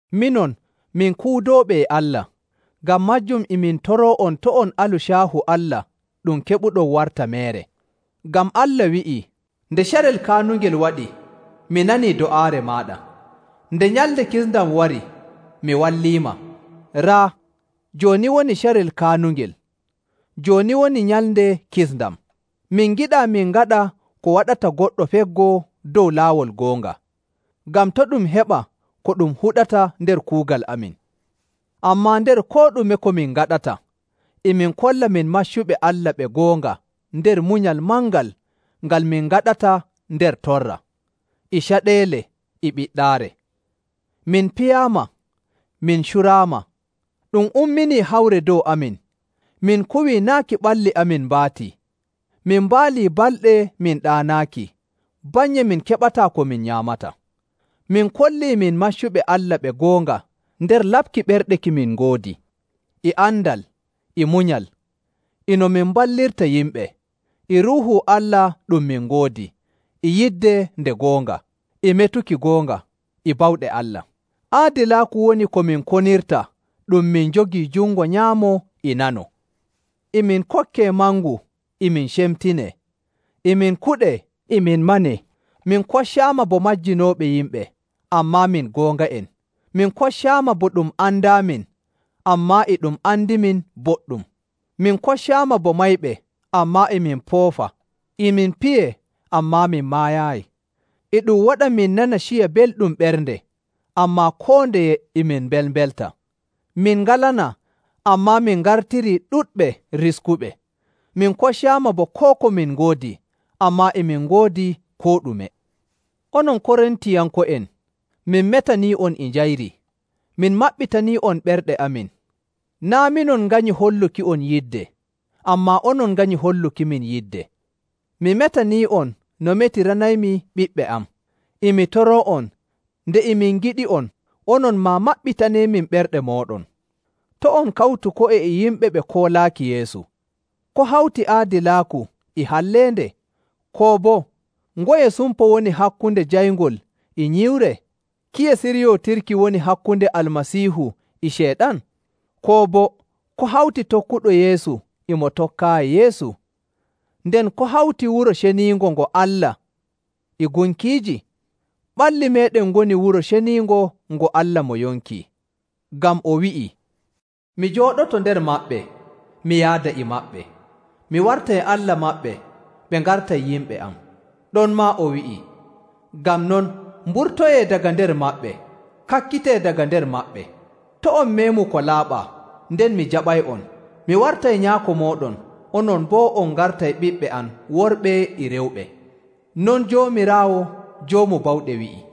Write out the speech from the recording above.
Minon, min kuudooɓe e Allah. Ngam maajum e min toroo'on to' on alu caahu Allah ɗum keɓuɗon warta meere. Ngam Allah wi'ii, “Nde carel kaanungel waɗi, mi nanii do'aare maaɗa, nde nyalnde kisndam wari, mi walliima.” Raa, jooni woni carel kaanungel, jooni woni nyalnde kisndam! Min ngiɗaa min ngaɗa ko waɗata goɗɗo feggoo dow laawol goonga, ngam to' ɗum heɓa ko ɗum huɗata nder kuugal amin. Ammaa nder koo ɗume ko min ngaɗata, e min kolla min maccuɓe Allah ɓe goonga nder munyal mangal ngal min ngaɗata nder torra, e caɗeele, e ɓiɗɗaare. Min piyaama, min curaama, ɗum umminii hawre dow amin, min kuwii naaki ɓalli amin mbaati, min mbaalii balɗe min ɗaanaaki, bannye min keɓataa ko min nyaamata. Min kollii min maccuɓe Allah ɓe goonga nder laɓki ɓerɗe ki min ngoodi, e andal, e munyal, e no min mballirta yimɓe, e Ruuhu Allah ɗum min ngoodi, e yidde nde goonga, e metuki goonga, e bawɗe Allah. Aadilaaku woni ko min konirta ɗum min njogii jungo nyaamo e nano. E min kokkee mangu, e min cemtinee, e min kuɗee, e min manee. Min koccaama bo majjinooɓe yimɓe, ammaa min goonga'en. Min koccaama bo ɗum andaamin, ammaa e ɗum andimin boɗɗum. Min koccaama bo mayɓe, ammaa e min poofa. E min piyee, ammaa min maayaayi. E ɗum waɗa min nana ciya belɗum ɓernde, ammaa koo ndeye e min mbelmbelta. Min ngalanaa, ammaa min ngartirii ɗuɗɓe riskuɓe. Min koccaama bo koo ko min ngoodi, ammaa e min ngoodi koo ɗume. Onon Korintiyanko'en, min metanii'on e njayri. Min maɓɓitanii'on ɓerɗe amin. Naa' minon nganyi holluki'on yidde, ammaa onon nganyi hollukimin yidde. Mi metanii'on no metiranaymi ɓiɓɓe am. E mi toroo'on, nde e min ngiɗi'on, onon maa maɓɓitaneemin ɓerɗe mooɗon. To' on kawtu ko'e e yimɓe ɓe koolaaki Yeesu. Ko hawti aadilaaku e halleende? Koo boo, ngoye sumpo woni hakkunde jayngol e nyiwre? Kiye siryootirki woni hakkunde Almasiihu e Ceyɗan? Koo boo, ko hawti tokkuɗo Yeesu e mo tokkaayi Yeesu? Nden ko hawti wuro ceniingo ngo Allah e gunkiiji? Ɓalli meeɗen ngoni wuro ceniingo ngo Allah mo yonki. Ngam o wi'i, “Mi jooɗoto nder maɓɓe, mi yaada e maɓɓe. Mi wartay Allah maɓɓe, ɓe ngartay yimɓe am.” Ɗonmaa o wi'i, “Ngam non, mburtoyee daga nder maɓɓe, kakkitee daga nder maɓɓe. To' on meemu ko laaɓaa, nden mi jaɓay'on. Mi wartay Nyaako mooɗon, onon boo on ngartay ɓiɓɓe am worɓe e rewɓe. Non Joomiraawo Joomu Bawɗe wi'i.”